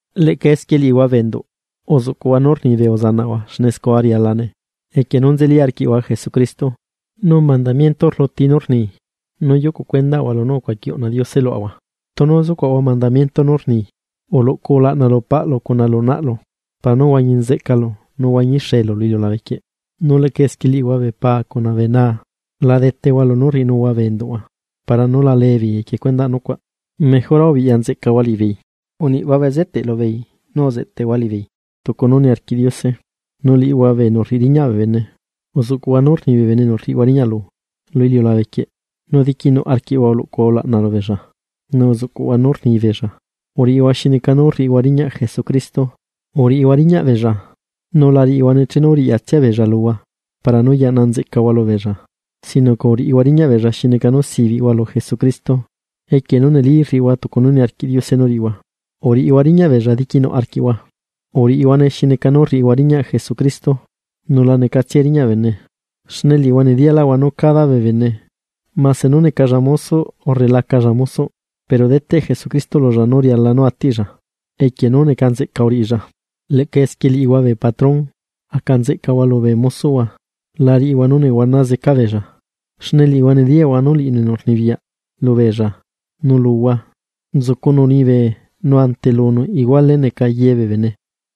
Leꞌca esquie liꞌihua bee enduꞌ, uzuꞌcuꞌhua nú rni bee uzanaꞌhua xne scua rialane, equie nú nzeli arquiꞌhua Jesucristo. Nu mandamiento rluti nú rni nú yucu cuendaꞌahua lunú ucuaqui uꞌna Diose luaꞌahua tunu zucuaꞌahua mandamiento nú rni: “Uluꞌcu ulaꞌna lu paꞌlu cuna lu naꞌlu, para nú huañi nzeꞌcalu nu huañixeelu lu iliulabe quieꞌ.” Nu leꞌca esquie liꞌihua bee paa cuna bee naa, la detehua lunú rriꞌinuhua bee enduꞌhua para nú la leebeei equie cuendaꞌ nucuaꞌ, mejora ubiꞌya nzeꞌcahua liꞌibeei, uniꞌhua bezeteꞌ lubeei nu uzeꞌtehua liꞌibeei tucu nú niarquiꞌ Diose. Nu liꞌihua bee enu rriꞌi riñaꞌ bee bene, uzuꞌcuꞌhua nú rni bene enu rriꞌihua riñaꞌlu lu iliulabe quieꞌ, nu diquinuꞌ arquiꞌhua uluꞌcuhua ulaꞌna lubeella, nu uzuꞌcuꞌhua nú rni beella, uriꞌihua xineca nú rriꞌihua riñaꞌ Jesucristo. Uriꞌihua riñaꞌ beella, nu la riꞌihuane chenu riꞌyatsia beella luhua para nú yaꞌna nzeꞌcahua lubeella, sino que uriꞌihua riñaꞌ beella xi neca nú sibiꞌhua lu Jesucristo, equie nú neli rriꞌihua tucu nú niarquiꞌ Diose nú riꞌihua. Uriꞌihua riñaꞌ beella diquinuꞌ arquiꞌhua, uriꞌihuane xi neca nú rriꞌihua riñaꞌ Jesucristo xne la necatsiae riñaꞌ bee bene. Nu liꞌihua nediyaꞌlaꞌhua nú cada bee bene, mase nú necalla mosoꞌ urre lacalla mosoꞌ, pero deteꞌ Jesucristo lulla nú riala nú atiꞌlla equie nú neca nzeꞌca uriꞌilla. Leꞌca esquie liꞌihua bee patrón, aca nzeꞌcahua lubee mosoꞌhua, la riꞌihua nú nehuana zeca beella. Xne liꞌihua nediyaꞌhua nu liꞌinu enu rnibiyaꞌ lubeella nu luhua nzucunu liñibe nu ante lunu iguale neca ye bee bene.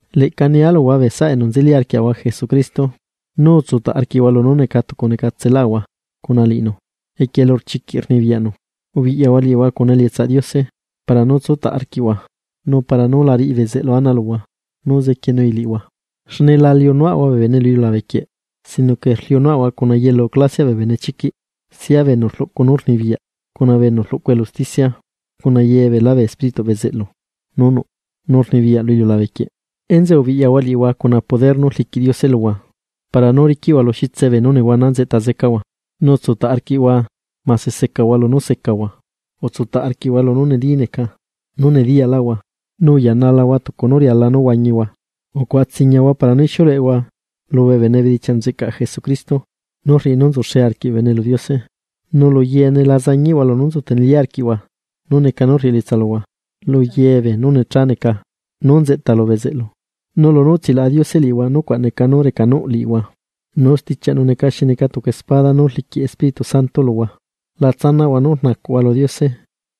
Leꞌca nia luhua bee saꞌa enu nzeli arquiaꞌahua Jesucristo nú utsutaꞌ arquiꞌhua lunú neca tucu necatselaꞌahua cuna liꞌinu, lunú chiquiꞌ rnibiyaꞌnu. Ubiꞌyahua liꞌihua cuna elietsaꞌ Diose para nú tsutaꞌ arquiꞌhua, nu para nú la riꞌi bezeꞌlu ana luhua nú zequienui liꞌihua. Xne la liunuaꞌahua bee bene lu iliulabe quieꞌ, sino que rliunuaꞌahua cuna yelu clasiaꞌ bee benechiquiꞌ, sia bee enu rluꞌcu nú rnibiyaꞌ, cuna enu rluꞌcu elu usticia, cuna ye beelá bee espírituꞌ bezeꞌlu nú nuꞌ, nu rnibiyaꞌ lu iliulabe quieꞌ. Enzeꞌe ubiꞌyahua liꞌihua cuna poder nú rliquiꞌ Diose luhua para nú riquiꞌhua lu xitse beenú nehuana nzeꞌta zecahua, nu utsutaꞌ arquiꞌhua mase secahua lunú secahua. Utsutaꞌ arquiꞌhua lunú neli neca nú nediyaꞌlaꞌhua, nu uyanalahua tucu nú riala nú huañihua. Ucuaꞌa tsiñahua para nú ixiuleꞌehua lubee bene bee bedichiaꞌ nzeꞌcaꞌ Jesucristo nú rriꞌi nú nzuxe arquiꞌ bee bene lu Diose. Nu lu yeene la zañiꞌhua lunú nzu tenelí arquiꞌhua, nú neca nú rriꞌi elietsa luhua luye beenú necha neca nú nzeꞌta lu bezeꞌlu. Nu lunú utsilaꞌa Diose liꞌihua nucuaꞌ neca nú recanuꞌ liꞌihua, nu stichiaꞌnu neca xi neca tucu espada nú rliquiꞌ Espíritu Santo luhua. La tsanaꞌhua nú rnacuꞌhua lu Diose.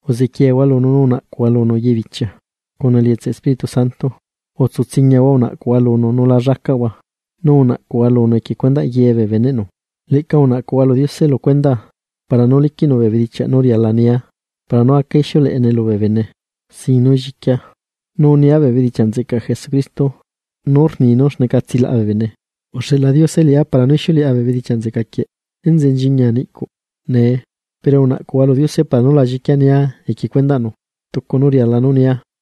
Uzequiehua lunu nu unaꞌcuhua lunu yebichia cuna elietsaꞌ Espíritu Santo. Utsutsiñahua unaꞌcuhua lunu nu la llacaꞌhua, nu unaꞌcuhua lunu equie cuendaꞌ ye bee beneꞌnu. Leꞌca unaꞌcuhua lu Diose lu cuendaa para nú liquiꞌnu bee bedichiaꞌ nú riala nia para nú aca ixiuleꞌene lubee bene sin nú lliquia, nu nia bee bedichiaꞌ nzeꞌcaꞌ Jesucristo nú rni nú xneca tsilaꞌa bee bene. Uxeꞌla Diose liꞌá para nú ixiuleꞌa bee bedichiaꞌ nzeꞌca quieꞌ, enzeꞌe nchiñia niꞌcuꞌ nee. Pero unaꞌcuhua lu Diose para nú la lliquia nia equie cuendaꞌnu tucu nú riala nú nia.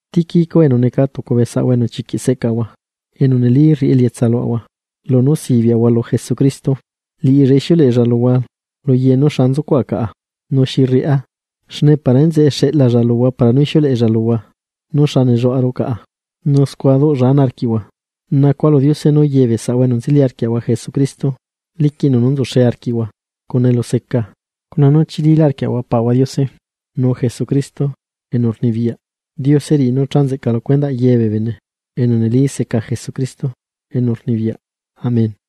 Tíquico, enu neca tucu bee saꞌahua enu chiquiꞌ seꞌcaꞌahua enu neli rriꞌi elietsa luaꞌahua lunú sibiaꞌahua lu Jesucristo, liꞌilla ixiuleꞌella luhua lu ye nú xa nzucuaꞌa caꞌa nu xi rriꞌá. Xne para enzeꞌe xeꞌlalla luhua para nú ixiuleꞌella luhua nú xa nelluaꞌaru caꞌa, nu scua duꞌlla ana arquiꞌhua. Nacua lu Diose nú ye bee saꞌahua enu nzeli arquiaꞌahua Jesucristo liquiꞌnu nú nzuxe arquiꞌhua, cuna eluseca, cuna nú chililá arquiꞌhua Paꞌahua Diose nu Jesucristo enu rnibiyaꞌ. Diose riꞌi nú cha nzeꞌca lu cuendaꞌ ye bee bene enu neli seca Jesucristo enu rnibiyaꞌ. Amén.